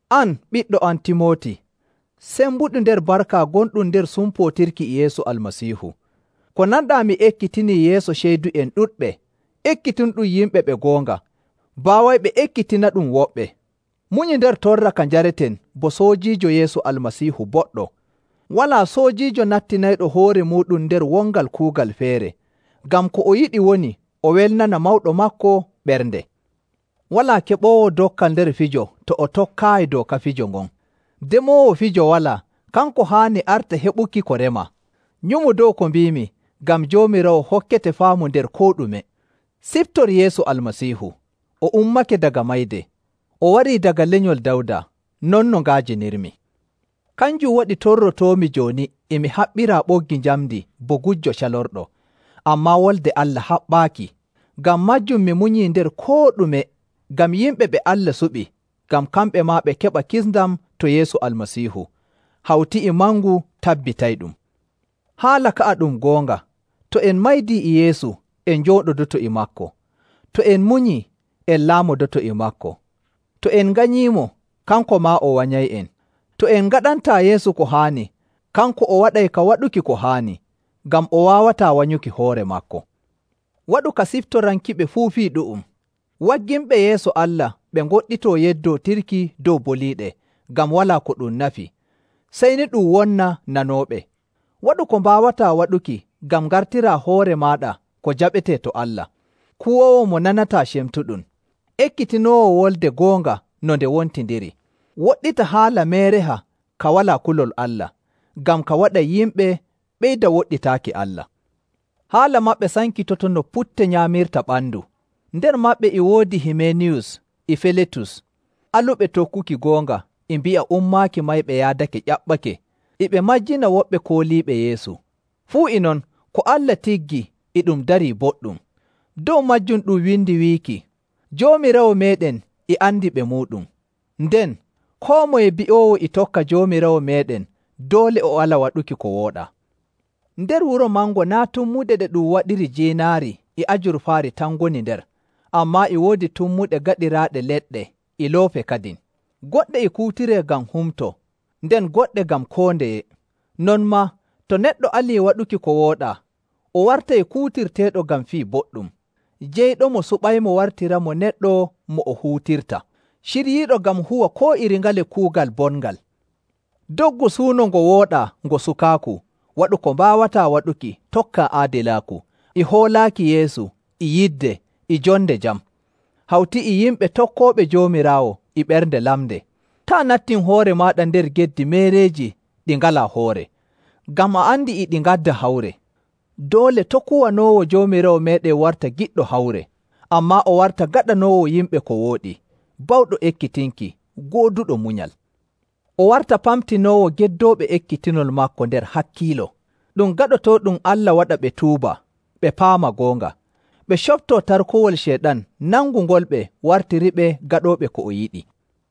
An, ɓiɗɗo am Timooti, sembuɗu nder barka gonɗum nder sumpootirki e Yeesu Almasiihu. Ko nanɗaa mi ekkitinii yeeso ceydu'en ɗuɗɓe, ekkitinɗum yimɓe ɓe goonga, baawayɓe ekkitinaɗum woɓɓe. Munyu nder torra ka njareten bo soojiijo Yeesu Almasiihu boɗɗo. Walaa soojiijo nattinayɗo hoore muuɗum nder wongal kuugal feere, ngam ko o yiɗi woni o welnana mawɗo maako ɓernde. Walaa keɓoowo dokkal nder fijo to o tokkaayi dooka fijo ngon. Demoowo fijo walaa, kanko haani arta heɓuki ko remaa. Nyumu dow ko mbiimi, ngam Joomiraawo hokkete faamu nder koo ɗume. Siftor Yeesu Almasiihu. O ummake daga mayde, o warii daga lenyol Dawda, non no nga'ajinirmi. Kanjum waɗi torrotoomi jooni e mi haɓɓiraa ɓoggi njamndi bo gujjo calorɗo, ammaa Wolde Allah haɓɓaaki. Ngam maajum mi munyii nder koo ɗume ngam yimɓe ɓe Allah suɓi, ngam kamɓe maa ɓe keɓa kisndam to Yeesu Almasiihu, hawti e mangu tabbitayɗum. Haala ka'a ɗum goonga: “To en maydii e Yeesu, en njooɗodoto e maako. To en munyii, en laamodoto e maako. To en nganyiimo, kanko maa o wanyay'en. To en ngaɗantaa Yeesu ko haani, kanko o waɗay ka waɗuki ko haani, ngam o waawataa wanyuki hoore maako.” Waɗu ka siftorankiɓe fuu fii ɗu'um, wagginɓe yeeso Allah ɓe ngoɗɗitoo yeddootirki dow boliiɗe, ngam walaa ko ɗum nafi, sey ni ɗum wonna nanooɓe. Waɗu ko mbaawataa waɗuki ngam ngartiraa hoore maaɗa ko jaɓetee to Allah, kuwoowo mo nanataa cemtuɗum, ekkitinoowo wolde goonga no nde wontindiri. Woɗɗita haala meereha ka walaa kulol Allah, ngam ka waɗay yimɓe ɓeyda woɗɗitaaki Allah. Haala maɓɓe sankitoto no putte nyaamirta ɓandu. Nder maɓɓe e woodi Himeeniyus e Filetus, aluɓe tokkuki goonga e mbi'a ummaaki mayɓe yaadake ƴaɓɓake. E ɓe majjina woɓɓe kooliiɓe Yeesu. Fuu e non, ko Allah tiggi e ɗum darii boɗɗum. Dow maajum ɗum windi wiiki, “Joomiraawo meeɗen e andi ɓe muuɗum,” nden, “Koo moye bi'oowo e tokka Joomiraawo meeɗen doole o ala waɗuki ko wooɗaa.” Nder wuro mango naa' tummuɗe ɗe ɗum waɗiri jiinaari e ajurfaari tan ngoni nder, ammaa e woodi tummuɗe gaɗiraaɗe leɗɗe e loope kadin. Goɗɗe e kuutiree ngam humto, nden goɗɗe ngam koo ndeye. Non maa to neɗɗo alii waɗuki ko wooɗaa, o wartay kuutirteeɗo ngam fii boɗɗum. Jeyɗomo suɓaymo wartiramo neɗɗo mo o huutirta, ciryiiɗo ngam huwa koo iri ngale kuugal bongal. Doggu suuno ngo wooɗaa ngo sukaaku, waɗu ko mbaawataa waɗuki tokkaa aadilaaku, e hoolaaki Yeesu, e yidde, e jonde jam, hawti e yimɓe tokkooɓe Joomiraawo e ɓernde lamnde. Taa' nattin hoore maaɗa nder geddi meereeji ɗi ngalaa hoore, ngam a andi e ɗi ngadda hawre. Doole to' kuwanoowo Joomiraawo meeɗen warta giɗɗo hawre, ammaa o warta gaɗanoowo yimɓe ko wooɗi, bawɗo ekkitinki, gooduɗo munyal. O warta pamtinoowo geddooɓe ekkitinol maako nder hakkiilo. Ɗum gaɗotooɗum Allah waɗa ɓe tuuba, ɓe paama goonga, ɓe coptoo tarkowol Ceyɗan nangungolɓe wartiriɓe gaɗooɓe ko o yiɗi.